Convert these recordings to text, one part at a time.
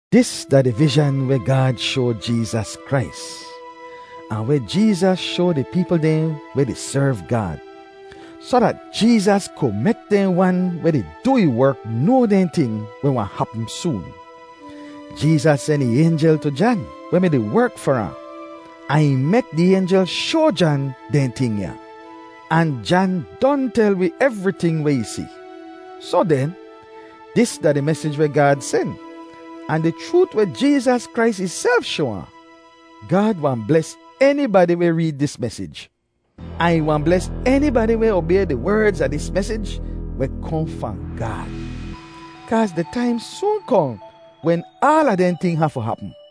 Dis da di vizhan weh Gaad shoa Jeezas Krais, ahn weh Jeezas shoa di peepl dehn weh di serv Gaad, soh dat Jeezas ku mek dehn wan weh di du ih werk noa dehn ting weh wahn hapm soon. Jeezas sen ih aynjel tu Jan, weh mi-di werk far ahn, ahn ih mek di aynjel shoa Jan dehn ting ya. Ahn Jan don tel wi evriting weh ih si. Soh den, dis da di mesij weh Gaad sen, ahn di chroot weh Jeezas Krais ihself shoa ahn. Gaad wahn bles enibadi weh reed dis mesij. Ahn ih wahn bles enibadi weh obay di werdz a dis mesij weh kohn fahn Gaad. Kaaz di taim soon kohn wen aala dehn ting hafu hapm.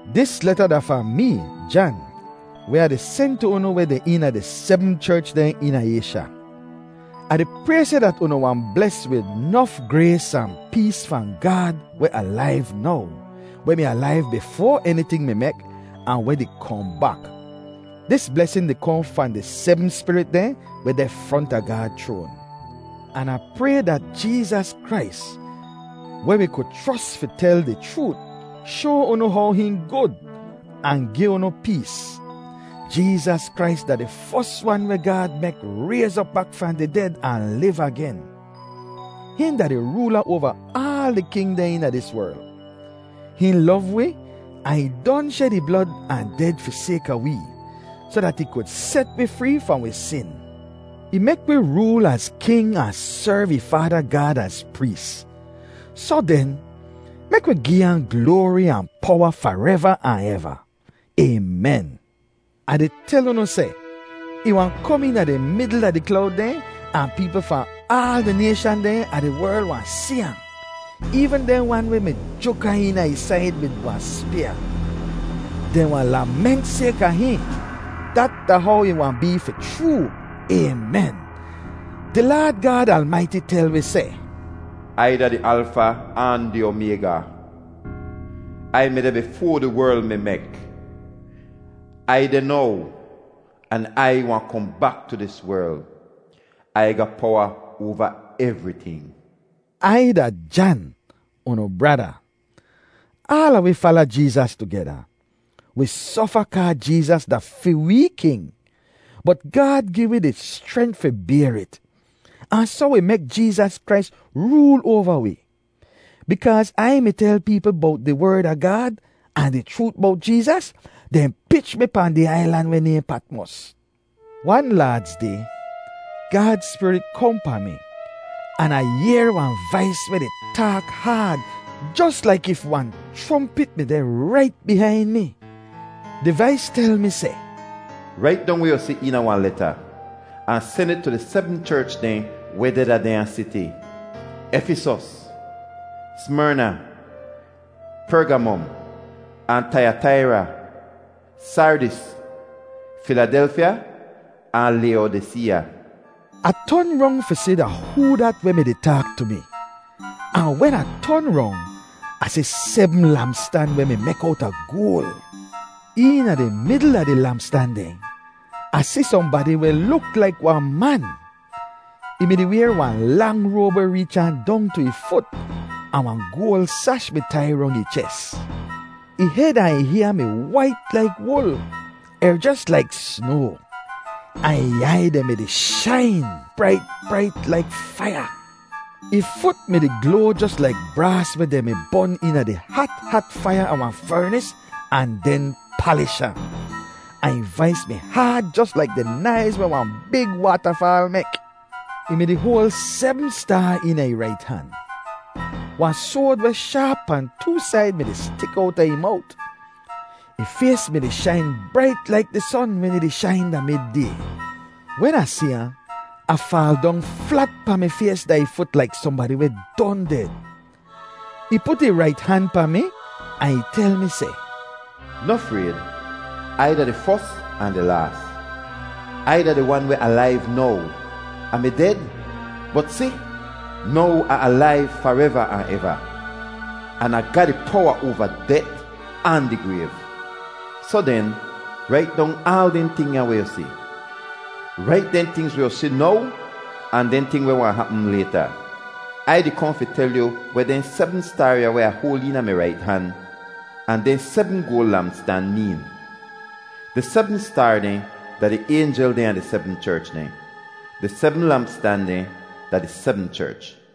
Dis leta da fahn mee, Jan, weh Ah di sen tu unu weh deh eena di sebm cherch dehn eena Aysha: Ah di pray seh dat unu wahn bles wid nof grays ahn pees fahn Gaad weh alaiv now, weh mi alaiv bifoa eniting mi mek, ahn weh di kohn bak. Dis blesin di kohn fahn di sebm spirit dehn weh deh fronta Gaad chroan. An Ah pray dat Jeezas Krais, weh wi ku chros fi tel di chroot, shoa unu how hihn gud, ahn gi unu pees. Jeezas Krais da di fos wan weh Gaad mek rayz op bak fahn di ded ahn liv agen. Hihn da di roola oava aal di king dehn eena dis werl. Hihn lov wi ahn ih don shed ih blod ahn ded fi sayka wee soh dat ih ku set wi free fahn wi sin. Ih mek wi rool az king ahn serv ih Faada Gaad az prees. Soh den, mek wi gi ahn gloari ahn powa fareva ahn eva. Aymen. Ah di tel unu seh, ih wahn kom eena di midl a di klowd dehn ahn peepl fahn aal di nayshan dehn a di werl wahn si ahn, eevn dehn wan weh mi juk ahn eena ih said wid wahn spyaa. Dehn wahn lament sayka hihn. Dat da how ih wahn bee fi chroo! Aymen. Di Laad Gaad Almaiti tel wi seh, “Ai da di Alfa ahn di Omayga. Ai mi deh bifoa di werl mi mek. Ai deh now, an Ai wahn kohn bak tu dis werl. Ai ga powa oava evriting.” Ai da Jan, unu brada. Aala wi di fala Jeezas tugeda. Wi sofa kaa Jeezas da fi wee king, bot Gaad gi wi di schrent fi bayr it. Ahn soh wi mek Jeezas Krais rool oava wi. Bikaaz Ai mi tel peepl bowt di Werd a Gaad ahn di chroot bowt Jeezas, dehn pich mi pahn di ailan weh nayhn Patmos. Wan Laadz Day, Gaad Spirit kohn pahn mi, an Ah yehr wahn vais weh di taak haad jos laik if wahn chrompit mi deh rait bihain mi. Di vais tel mi seh, “Rait dong weh yu si eena wahn leta, ahn sen it tu di sebm cherch dehn weh deh da dehnya siti: Efisos, Smerna, Pergamom, ahn Taiyataira, Sardis, Filadelfya ahn Layodiseeya.” Ah ton rong fi si da hoo dat weh mi-di taak tu mi. Ahn wen Ah ton rong, Ah si sebm lampstan weh mi mek owta goal. Eena di midl a di lampstan dehn, Ah si sohnbadi weh luk laik wahn man. Ih mi-di wayr wahn lang roab weh reech ahn dong tu ih fut, ahn wahn goal sash mi tai rong ih ches. Ih hed ahn ih hyaa mi wait laik wul, er jos laik snoa. Ahn ih aiy dehn mi-di shain brait, brait laik faiya. Ih fut mi-di gloa jos laik braas weh dehn mi bon eena di hat hat faiya a wahn fernis ahn den palish ahn. Ahn ih vais mi haad jos laik di naiz weh wahn big waatafaal mek. Ih mi-di hoal sebm staar eena ih rait han. Wahn soad weh shaap pahn too said mi-di stik owta ih mowt. Ih fays mi-di shain brait laik di son wen ih di shain da mid-day. Wen Ah si ahn, Ah faal dong flat pahn mi fays da ih fut laik sohnbadi weh don ded. Ih put ih rait han pahn mi ahn ih tel mi seh, “Noh frayd! Ai da di Fos ahn di Laas. Ai da di Wan weh alaiv now! Ah mi ded, bot si, now Ah alaiv fareva ahn eva! An Ah ga di powa oava det ahn di grayv. “Soh den, rait dong aal dehn ting ya weh yu si. Rait dehn tingz weh yu si now ahn dehn ting weh wahn hapm layta. Ai di kohn fi tel yu weh dehn sebm staar ya weh Ah hoal eena mi rait han, ahn dehn sebm goal lampstan, meen. Di sebm staar dehn da di aynjel dehn a di sebm cherch dehn. Di sebm lampstan dehn da di sebm cherch.